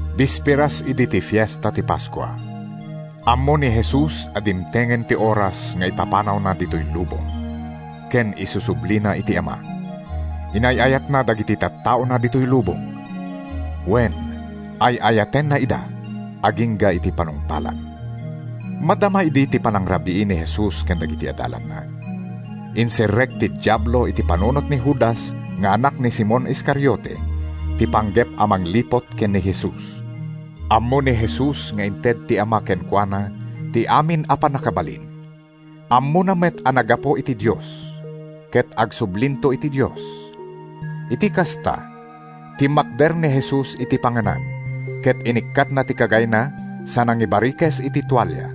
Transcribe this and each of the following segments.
Bisperas idi ti Fiesta ti Paskua. Ammo ni Jesus a dimtengen ti oras nga ipapanawna ditoy lubong ken isusublina iti Ama. Inay-ayatna dagiti tattaona ditoy lubong. Wen, ay-ayatenna ida agingga iti panungpalan. Madama idi ti panangrabii ni Jesus ken dagiti adalanna. Inserrek ti Diablo iti panunot ni Judas nga anak ni Simon Iscariote ti panggep a mangliput ken ni Jesus. Ammo ni Jesus nga inted ti Ama kenkuana ti amin a pannakabalin. Ammona met a naggapu iti Dios ket agsublinto iti Dios. Iti kasta, timmakder ni Jesus iti panganan ket inikkatna ti kagayna sa nangibarikes iti tualia.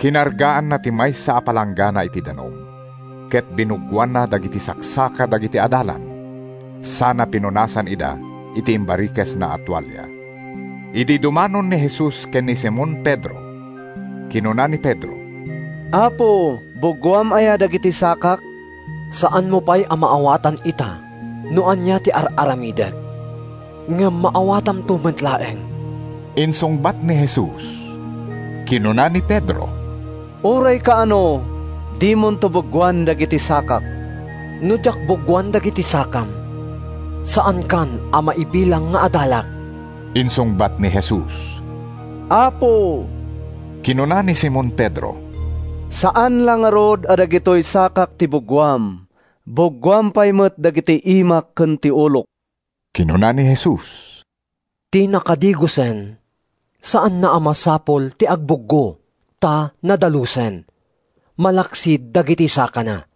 Kinargaanna ti maysa a palanggana iti danum ket binuggoanna dagiti saksaka dagiti adalan sana pinunasan ida iti imbarikesna a tualia. Idi dumanon ni Jesus ken ni Simon Pedro, kinuna ni Pedro, “Apo, buggoam aya dagiti sakak?” “Saanmo pay a maawatan ita no ania ti ar-aramidek, ngem maawatamto met laeng,” insungbat ni Jesus. Kinuna ni Pedro, “Uray kaano, dimonto buggoan dagiti sakak!” “No diak buggoan dagiti sakam, saankan a maibilang nga adalak,” insungbat ni Jesus. “Apo,” kinuna ni Simon Pedro, “saan la ngarud a dagitoy sakak ti buggoam. Buggoam pay dagiti imak ken ti ulok!” Kinuna ni Jesus, “Ti nakadigosen saanna a masapul ti agbuggo, ta nadalusen, malaksid dagiti sakana.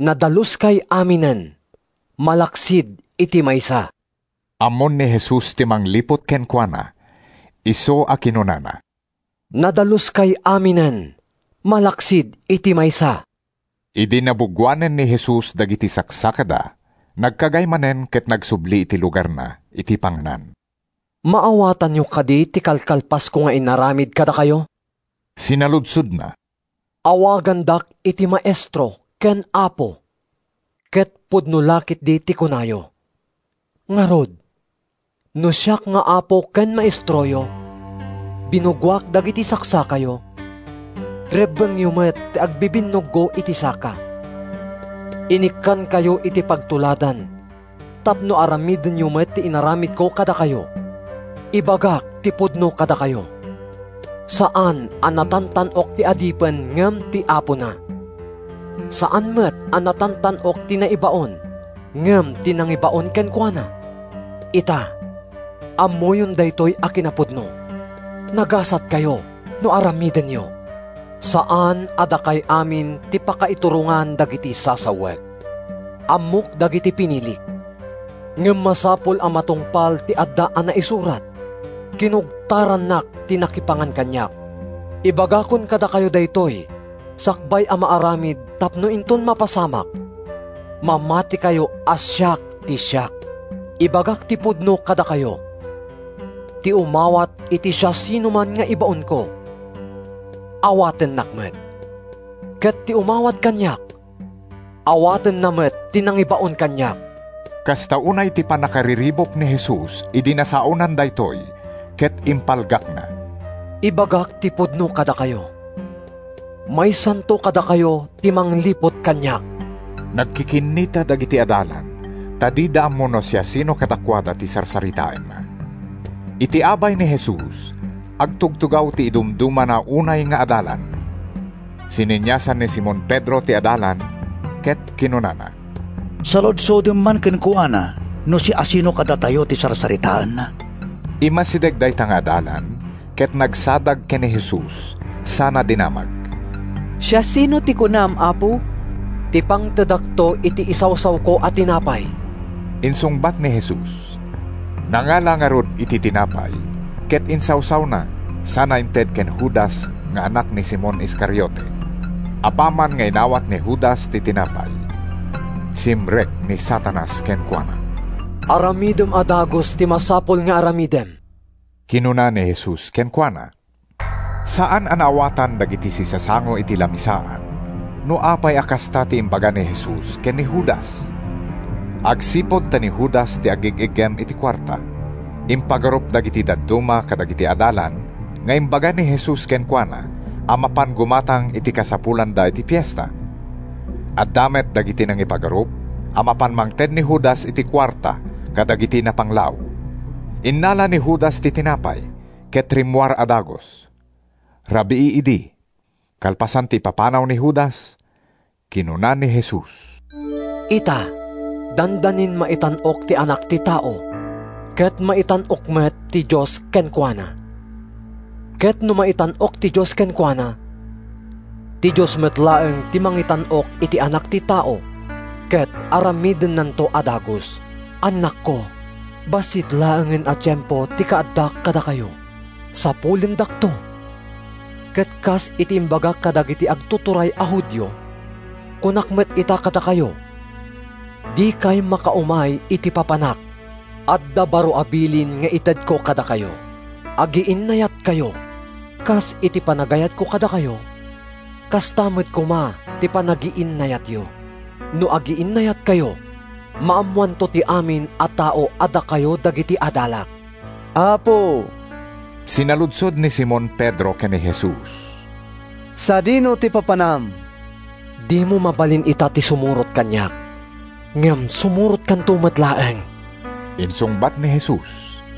Nadaluskay aminen—malaksid iti maysa.” ( Ammon ni Jesus ti mangliput kenkuana, isu a kinunana, “Nadaluskay aminen malaksid iti maysa.”) Idi nabuggoanen ni Jesus dagiti saksakada, nagkagay manen ket nagsubli iti lugarna iti panganan. “Maawatanyo kadi ti kalkalpasko nga inaramid kadakayo?” sinaludsodna. “Awagandak iti ‘Maestro’ ken ‘Apo,’ ket pudno la ketdi ti kunayo. Ngarud, no siak nga Apo ken Maestroyo, binuggoak dagiti saksakayo, rebbengyo met ti agbibinnuggo iti saka. Inikkankayo iti pagtuladan tapno aramidenyo met ti inaramidko kadakayo. Ibagak ti pudno kadakayo: Saan a natantan-ok ti adipen ngem ti apona. Saan met a natantan-ok ti naibaon ngem ti nangibaon kenkuana. Ita, ammoyon daytoy a kinapudno. Nagasatkayo no aramidenyo! “Saan a dakay amin ti pakaiturongan dagiti sasawek. Ammok dagiti pinilik. Ngem masapul a matungpal ti adda a naisurat, ‘Kinugtarannak ti nakipangan kaniak.’ Ibagakon kadakayo daytoy sakbay a maaramid tapno inton mapasamak, mamatikayo a siak ti siak. Ibagak ti pudno kadakayo: Ti umawat iti siasinoman nga ibaonko, awatennak met. Ket ti umawat kaniak, awatenna met ti nangibaon kaniak.” Kasta unay ti pannakariribuk ni Jesus idi nasaonan daytoy ket impalgakna, “Ibagak ti pudno kadakayo: Maysanto kadakayo ti mangliput kaniak.” Nagkikinnita dagiti adalan ta dida ammo no siasino kadakuada ti sarsaritaenna. Iti abay ni Jesus, agtugtugaw ti idumdumana unay nga adalan. Sineniasan ni Simon Pedro ti adalan ket kinunana, “Saludsodem man kenkuana no siasino kadatayo ti sarsaritaenna.” Immasideg dayta nga adalan ket nagsadag ken ni Jesus sana dinamag, “Siasino ti kunam, Apo?” “Ti pangtedakto iti isawsawko a tinapay,” insungbat ni Jesus. Nangala ngarud iti tinapay ket insawsawna sana inted ken Judas nga anak ni Simon Iscariote. Apaman nga inawat ni Judas ti tinapay, simrek ni Satanas kenkuana. “Aramidem a dagus ti masapul nga aramidem,” kinuna ni Jesus kenkuana. Saan a naawatan dagiti sisasango iti lamisaan no apay a kasta ti imbaga ni Jesus ken ni Judas. Agsipud ta ni Judas ti agig-iggem iti kuarta, impagarup dagiti dadduma kadagiti adalan nga imbaga ni Jesus kenkuana a mapan gumatang iti kasapulanda iti fiesta. Adda met dagiti nangipagarup a mapan mangted ni Judas iti kuarta kadagiti napanglaw. Innala ni Judas ti tinapay, ket rimmuar a dagus. Rabii idi. Kalpasan ti ipapanaw ni Judas, kinuna ni Jesus, “Ita, dandanin maitan-ok ti Anak ti Tao, ket maitan-ok met ti Dios kenkuana. Ket no maitan-ok ti Dios kenkuana, ti Dios met laeng ti mangitan-ok iti Anak ti Tao, ket aramidennanto a dagus. Annakko, bassit laengen a tiempo ti kaaddak kadakayo. Sapulendakto, ket kas iti imbagak kadagiti agtuturay a Judio, kunak met ita kadakayo, ‘Dikay makaumay iti papanak.’ “Adda baro a bilin nga itedko kadakayo: Agiinnayatkayo. Kas iti panagayatko kadakayo, kasta met koma ti panagiinnayatyo. No agiinnayatkayo, maammoanto ti amin a tao a dakayo dagiti adalak.” “Apo,” sinaludsod ni Simon Pedro ken ni Jesus, “sadino ti papanam?” “Dimo mabalin ita ti sumurot kaniak, ngem sumurotkanto met laeng,” insungbat ni Jesus.